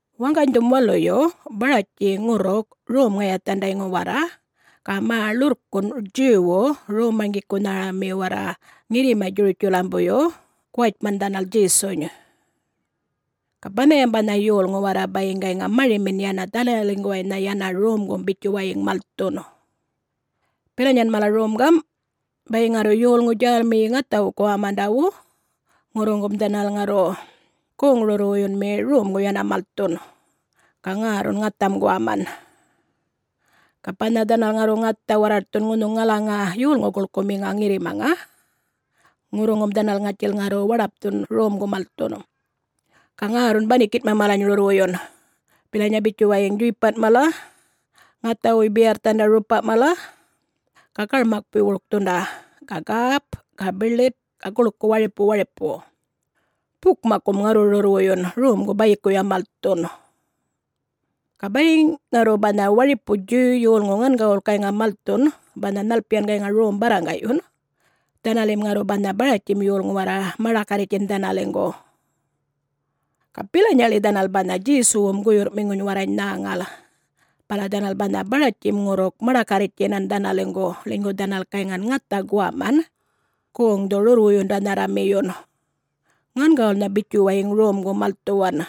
Waŋganydhum waluyu Baratji ŋurruk Rom-ŋayathandayŋu warra, ga mä ḻurrkunꞌ Djuwwu Rom-marŋgikunharami warra ŋirrima Djurutjalambuyyu guwatjman dhanal Djesuny. Ga banhayam banha yolŋu warra bayiŋ gayŋa marimin yana dhanaliŋguwaynha yana romgum bitjuwayiŋ malthun. Bilanyan mala rom gamꞌ: bayiŋ ŋarru yolŋu djälmiyi ŋathawu guwamandawu, ŋurruŋum dhanal ŋarru goŋ-rurrwuyunmi romgu yana malthun ga ŋärrun ŋatham guwaman. Ga banha dhanal ŋarru ŋatha warraṯthun ŋunhuŋ ŋalaŋa yolŋu guḻkuꞌmiŋa ŋirrimaŋa, ŋurruŋum dhanal ŋatjil ŋarru waḏapthun romgu malthun. Ga ŋärrun banikinꞌma malany rurrwuyun bilanya bitjuwayiŋ djuypanꞌ mala, ŋathawuy biyarrthanda rupa mala, ga garmakpuy wurkthunda ga gäp ga biḻit ga guḻku waripu waripu. Bukmakkum ŋarru rurrwuyun, romgu bayikuya malthun. Ga bayiŋ ŋarru banha waripu Djuw yolŋu ŋangawul gayŋa malthun banha nhalpiyan gayŋa rom barraŋgaꞌyun, dhanalim ŋarru banha Baratjim yolŋu warra maḏakarritjtjin dhanaliŋgu. Ga bilanyaḻi dhanal banha Djesuwum guyurrꞌmiŋuny warrany nhäŋal, bala dhanal banha Baratjim ŋurruk maḏakarritjinan dhanaliŋgu, ḻinygu dhanal gayŋan ŋatha guwaman, goŋdhu-rurrwuyundanharramiyun, ŋangawulnha bitjuwayiŋ romgu malthuwan.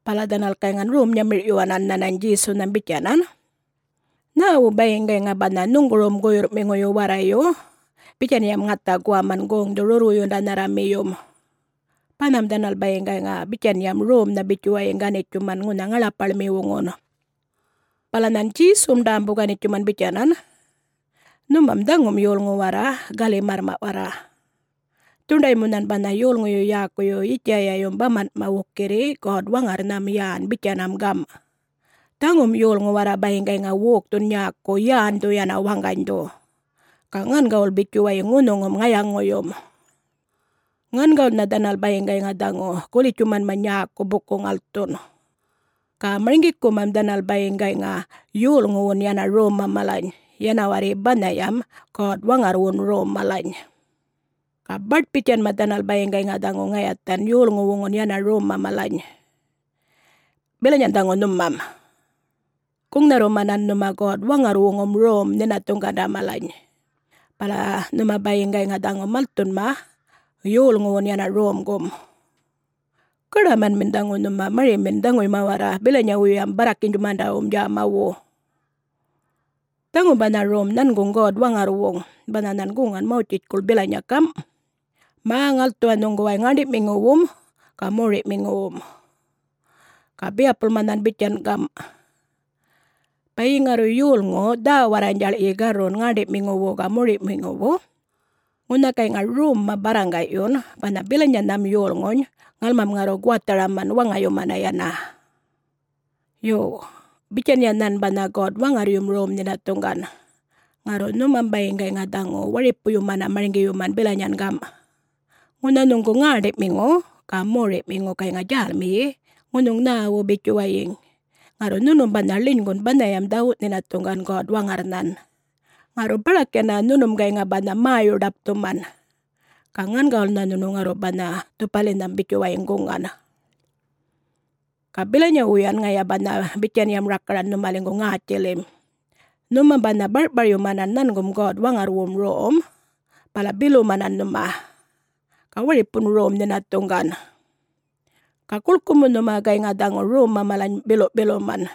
Bala dhanal gayŋan rom-nyamirꞌyuwanan nhanany Djesunham bitjanan, “Nhäwu bayiŋ gayŋa banha nhuŋgurum guyurrꞌmiŋuyu warrayu bitjanyam ŋatha guwaman goŋdhu-rurrwuyundanharramiyum? Banham dhanal bayiŋ gayŋa bitjanyam romnha bitjuwayiŋ ganitjuman ŋunha ŋaḻapaḻmiwuŋun!” Bala nhan Djesum ḏämbu-ganitjuman bitjanan, “Nhumam dhaŋum yolŋu warra gali-märrmaꞌ warra. Dhuṉḏaymu nhan banha yolŋuyu yäkuyu Yitjayayum bamanꞌma wukirri God-Waŋarrnham yän bitjanam gamꞌ, ‘Dhaŋum yolŋu warra bayiŋ gayŋa wokthun nyäku yändhu yan waŋganydhu, ga ŋangawul bitjuwayiŋ ŋunhuŋum ŋayaŋuyum. Ŋangawulnha dhanal bayiŋ gayŋa dhaŋu gulitjumanma nyäku buku-ŋalthun, ga marŋgikumam dhanal bayiŋ gayŋa yolŋuwun yana romma malany, yana warri banhayam God-Waŋarrwun rom malany. Ga baṯ-bitjanma dhanal bayiŋ gayŋa dhaŋu ŋayathan yolŋuwuŋun yana romma malany.’ Bilanyayan dhaŋu nhumam. Guŋnharrumanan nhuma God-Waŋarrwuŋum rom nhinathuŋganda malany, bala nhuma bayiŋ gayŋa dhaŋu malthunma yolŋuwun yana romgum. Gaḏamanmin dhaŋu nhumam marimin dhaŋuyma warra bilanyawum barrakinydjumandawum djämawu! Dhaŋum banha rom nhanguŋ God-Waŋarrwuŋ, banha nhan guŋan Mawtjitjkuḻ bilanya gam', ‘Mä-ŋalthuwa nhuŋguway ŋäṉḏi'miŋuwum ga mori'miŋuwum.’ Ga biyapulma nhan bitjan gam', ‘Bayiŋ ŋarru yolŋu dhä-warranydjaḻ'yi garrun ŋäṉḏi'miŋuwu ga mori'miŋuwu, ŋunha gayŋa romma barraŋga'yun banha bilanyanham yolŋuny ŋalmam ŋarru guwatharaman waŋayumana yana.’ Yo, bitjanya nhan banha God-Waŋarryum rom nhinathuŋgan, ŋarru nhumam bayiŋ gayŋa dhaŋu waripuyumana marŋgiyuman bilanyan gamꞌ, ‘Ŋunha nhuŋgu ŋäṉḏiꞌmiŋu ga moriꞌmiŋu gayŋa djälmiyi ŋunhuŋ nhäwu bitjuwayiŋ, ŋarru nhunum banha ḻinygun banhayam dhawuꞌ-nhinathuŋgan God-Waŋarrnhan, ŋarru baḏak yana nhunum gayŋa banha mäyu-ḏapthuman, ga ŋangawulnha nhunu ŋarru banha dhupalinham bitjuwayiŋ guŋan.’ Ga bilanyawuyan ŋaya banha bitjanyam rakaran nhumaliŋgu ŋätjilim, nhumam banha barꞌparyumanan nhangum God-Waŋarrwum rom, bala bilumanan nhuma, ga waripun rom nhinathuŋgan. Ga guḻku mu nhuma gayŋan dhaŋu romma malany biluꞌ-biluman.”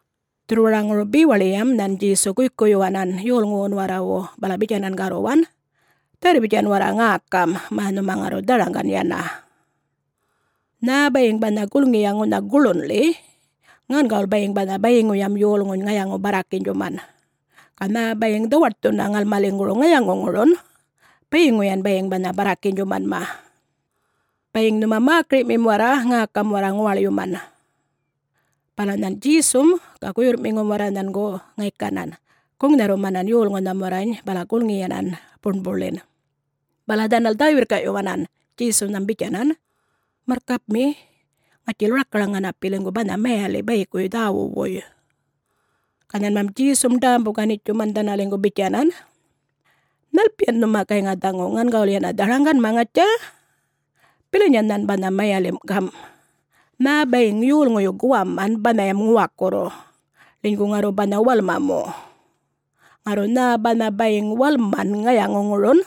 Dhurrwaraŋuru bewaḻiyam nhan Djesu guykuyyuwanan yolŋuwun warrawu bala bitjanan garruwan, “Dharr-bitjan warra ŋäkam, mä nhuma ŋarru dharaŋgan yana. Nhä bayiŋ banha gulŋiya ŋunha guḻunḻi, ŋangawul bayiŋ banha bayiŋuyam yolŋuny ŋayaŋu-barrakinydjuman. Ga nhä bayiŋ dhawaṯthuna ŋalmaliŋguru ŋayaŋuŋurun, bayiŋuyan bayiŋ banha barrakinydjumanma. [Bayiŋ nhuma mäkiriꞌmim warra, ŋäkam warra ŋuwaḻyuman!]” Bala nhan Djesum ga guyurrꞌmiŋum warra nhangu ŋaykanan guŋnharrumanan yolŋunham warrany bala gulŋiyanan buṉbuḻin. Bala dhanal dhä-wirrkaꞌyuwanan Djesunham bitjanan, “Marrkapmi, ŋatjil rakaraŋ ŋanapiliŋgu banha mayaliꞌ bayikuy dhäwuꞌwuy.” Ga nhanmam Djesum ḏämbu-ganitjuman dhanaliŋgu bitjanan, “Nhalpiyan nhuma gayŋa dhaŋu ŋangawul yana dharaŋganma, ŋatja? Bilanya nhan banha mayalim' gam': nhä bayiŋ yolŋuyu guwaman banhayam ŋuwakurru, ḻinygu ŋarru banha walma mu. Ŋarru nhä banha bayiŋ walman ŋayaŋurun,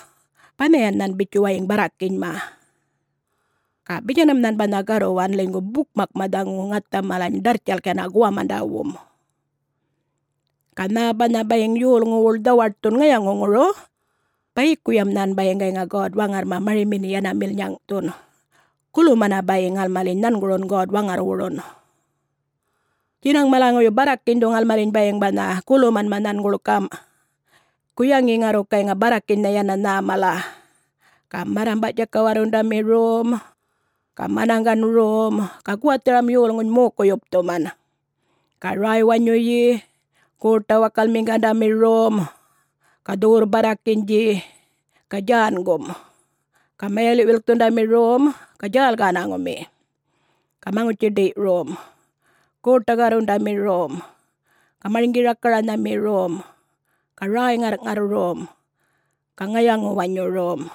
banhayan nhan bitjuwayiŋ barrakinyma.” (Ga bitjanam nhan banha garruwan, ḻinygu bukmakma dhaŋu ŋatha malany ḏarrtjalk yana guwamandawum.) “Ga nhä banha bayiŋ yolŋuwuḻ dhawaṯthun ŋayaŋuŋuru, bayikuyam nhan bayiŋ gayŋa God-Waŋarrma marimin yana milnyaŋꞌthun, gulumana bayiŋ ŋalmaliny nhangurun God-Waŋarrwurun. Djinaŋ malaŋuyu barrakinydhu ŋalmaliny bayiŋ banha gulumanma nhanguḻ gamꞌ: guyaŋi ŋarru gayŋa barrakinynha yana nhä mala, ga marrambaꞌ-djakawarrundami rom, ga manaŋgan rom ga guwatharam yolŋuny mokuy-yupthuman ga räy-wanyuyi, goṯa-wakalmiŋgandami rom, ga dhuwurr-barrakinydji, ga djängum, ga mayaliꞌ-wilkthundami rom, ga djäl-gänaŋumi, ga maŋutji-ḏiyꞌ rom, goṯa-garrundami rom, ga marŋgi-rakaranhami rom, ga räy-ŋarrꞌŋarr rom, ga ŋayaŋu-wanyu rom.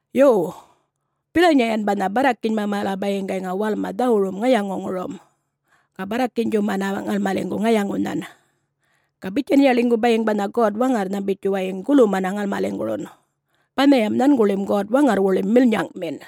Yo, bilanyayan banha barrakinyma mala bayiŋ gayŋa walma dhawurum ŋayaŋuŋurum, ga barrakinydjumana ŋalmaliŋgu ŋayaŋunhan. Ga bitjanya ḻinygu bayiŋ banha God-Waŋarrnham bitjuwayiŋ gulumana ŋalmaliŋgurun, banhayam nhanguḻim God-Waŋarrwuḻim milnyaŋꞌmin.”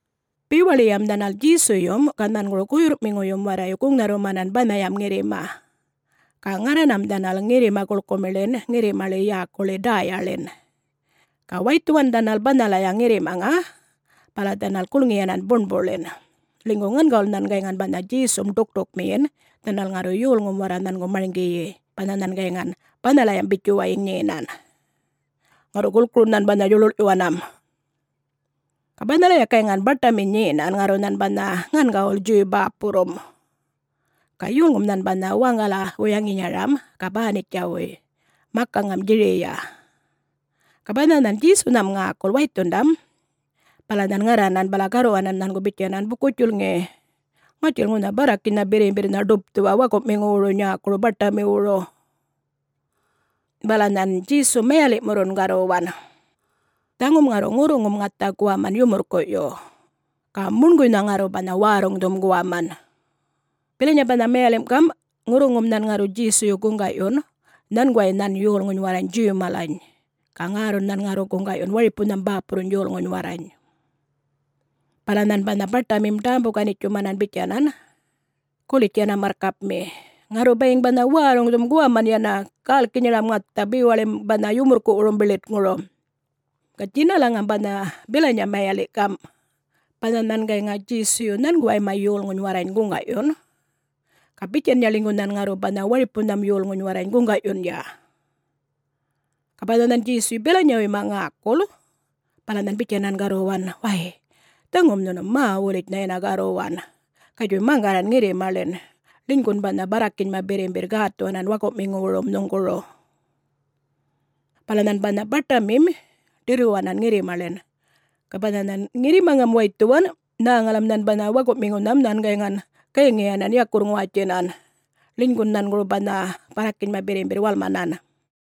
Bewaḻiyam dhanal Djesuyum ga nhanguru guyurrꞌmiŋuyum warrayu guŋnharrumanan banhayam ŋirrima. Ga ŋarranam dhanal ŋirrima-guḻkumiḻin ŋirrimaḻi yäkuḻi Däyaḻin. Ga waythuwan dhanal banhalaya ŋirrimaŋa bala dhanal gulŋiyanan buṉbuḻin, ḻinygu ŋangawul nhan gayŋan banha Djesum ḏukṯukmiyin dhanal ŋarru yolŋum warra nhangu marŋgiyi banha nhan gayŋan banhalayam bitjuwayiŋ nyenan. Ŋarru gulkurun nhan banha djuḻuḻꞌyuwanam. Ga banhalaya gayŋan baṯami nyenan ŋarru nhan banha ŋangawul Djuw bäpurrum. Ga yolŋum nhan banha waŋgala-wuyaŋinyaram ga Bänitjawuy, makaŋam Djiriya. Ga banha nhan Djesunham ŋäkul waythundam bala nhan ŋarranan bala garruwanan nhangu bitjanan, “Buku-djulŋi, ŋatjil ŋunha barrakinynha birrimbirrnha ḏupthuwa wakuꞌmiŋuwuru nyäkuru baṯamiwuru.” Bala nhan Djesum mayaliꞌmurrun garruwan, “Dhaŋum ŋarru ŋurruŋum ŋatha guwaman yumurrkuꞌyu, ga muṉguynha ŋarru banha wärruŋdhum guwaman.” [Bilanya banha mayalimꞌ gamꞌ: ŋurruŋum nhan ŋarru Djesuyu guŋgaꞌyun nhanguway nhan yolŋuny warrany Djuw malany ga ŋärrun nhan ŋarru guŋgaꞌyun waripunham bäpurruny yolŋuny warrany.] Bala nhan banha baṯamim ḏämbu-ganitjuman bitjanan, “Gulitj yana marrkapmi. Ŋarru bayiŋ banha wärruŋdhum guwaman yana gälkinyaram ŋatha bewalim banha yumurrkuꞌwurum biḻitŋuru.” [Ga djinalaŋam banha bilanya mayaliꞌ gamꞌ: banha nhan gayŋa Djesuyu nhanguwayma yolŋuny warrany guŋgaꞌyun, ga bitjanya ḻinygu nhan ŋarru banha waripunham yolŋuny warrany guŋgaꞌyunya.] Ga banha nhan Djesuyu bilanyawuyma ŋäkul bala nhan bitjanan garruwan, “Way, dhaŋum nhunu mä-wulitjnha yana garruwan. Gatjuy maŋgarran ŋirrimaḻin, ḻinygun banha barrakinyma birrimbirr gätthuwanan wakuꞌmiŋuwurum nhuŋguru.” Bala nhan banha baṯamim ḏirruwanan ŋirrimaḻin. Ga banha nhan ŋirrimaŋam waythuwan, nhäŋalam nhan banha wakuꞌmiŋunham nhan gayŋan gayŋiyanan yakurr-ŋuwatjinan, ḻinygun nhanguru banha barrakinyma birrimbirr walmanan.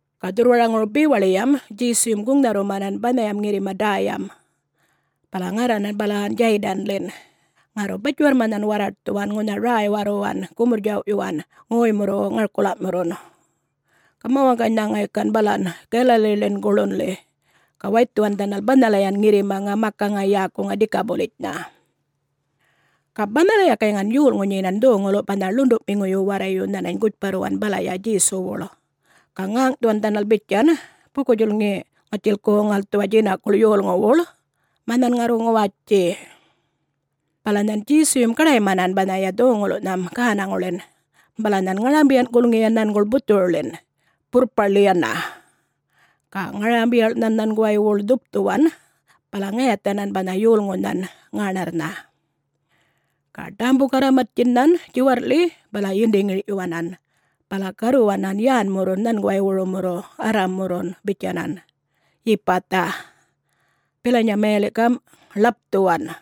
Ga dhurrwaraŋuru bewaḻiyam Djesuyum guŋnharrumanan banhayam ŋirrima Däyam, bala ŋarranan balan Djaydanḻin, ŋarru batjiwarrma nhan warraṯthuwan ŋunha räy-warruwan, gumurr-djawꞌyuwan ŋoymurru ŋarkulaꞌmurrun. Ga mä-waŋganynha ŋaykan balan Galaliḻin guḻunḻi ga waythuwan dhanal banhalayan ŋirrimaŋa makaŋa yäkuŋa ‘Dikapulitjnha’. Ga banhalaya gayŋan yolŋu nyenan dhoŋuluꞌ banha ḻunduꞌmiŋuyu warrayu nhanany gutjparruwan balaya Djesuwuḻ. Ga ŋäŋꞌthuwan dhanal bitjan, “Buku-djulŋi ŋatjil goŋ-ŋalthuwa djinakuḻ yolŋuwuḻ mä nhan ŋarru ŋuwatji.” Bala nhan Djesuyum gaḏaymanan banhaya dhoŋuluꞌnham gänaŋuḻin, bala nhan ŋarambiyan gulŋiyan nhanguḻ buthuruḻin, burrparḻi yana. Ga ŋarambiyaḻ nhan nhanguwaywuḻ dhupthuwan, bala ŋayathanan banha yolŋunhan ŋäṉarrnha. Ga ḏämbu-garramattjin nhan djiwarrꞌḻi bala yindi-ŋirꞌyuwanan bala garruwanan yänmurrun nhanguwaywurumurru Arrammurrun bitjanan, “Yipatha!” Bilanya gamꞌ mayaliꞌ, “Ḻapthuwan!”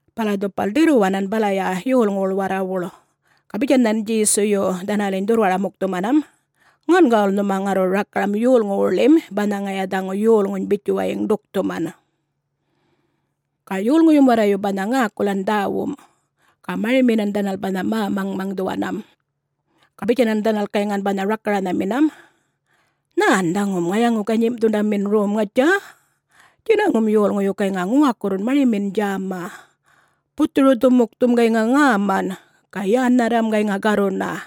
Bala dhupal ḏirruwanan balaya yolŋuwuḻ warrawuḻ. Ga bitjan nhan Djesuyu dhanaliny dhurrwara-mukthumanam, “Ŋangawul nhuma ŋarru rakaram yolŋuwuḻim banha ŋaya dhaŋu yolŋuny bitjuwayiŋ ḏukthuman.” Ga yolŋuyum warrayu banha ŋäkulan dhäwum, ga mariminan dhanal banha mä-maŋmaŋdhuwanam. Ga bitjanan dhanal gayŋan banha rakaranhaminam, “Nhän dhaŋum ŋayaŋu-ganyimꞌthundamin rom, ŋatja! Djinaŋum yolŋuyu gayŋa ŋuwakurrun marimin djäma. Buthuru-dhumukthum gayŋa ŋäman ga yännharram gayŋa garruna.”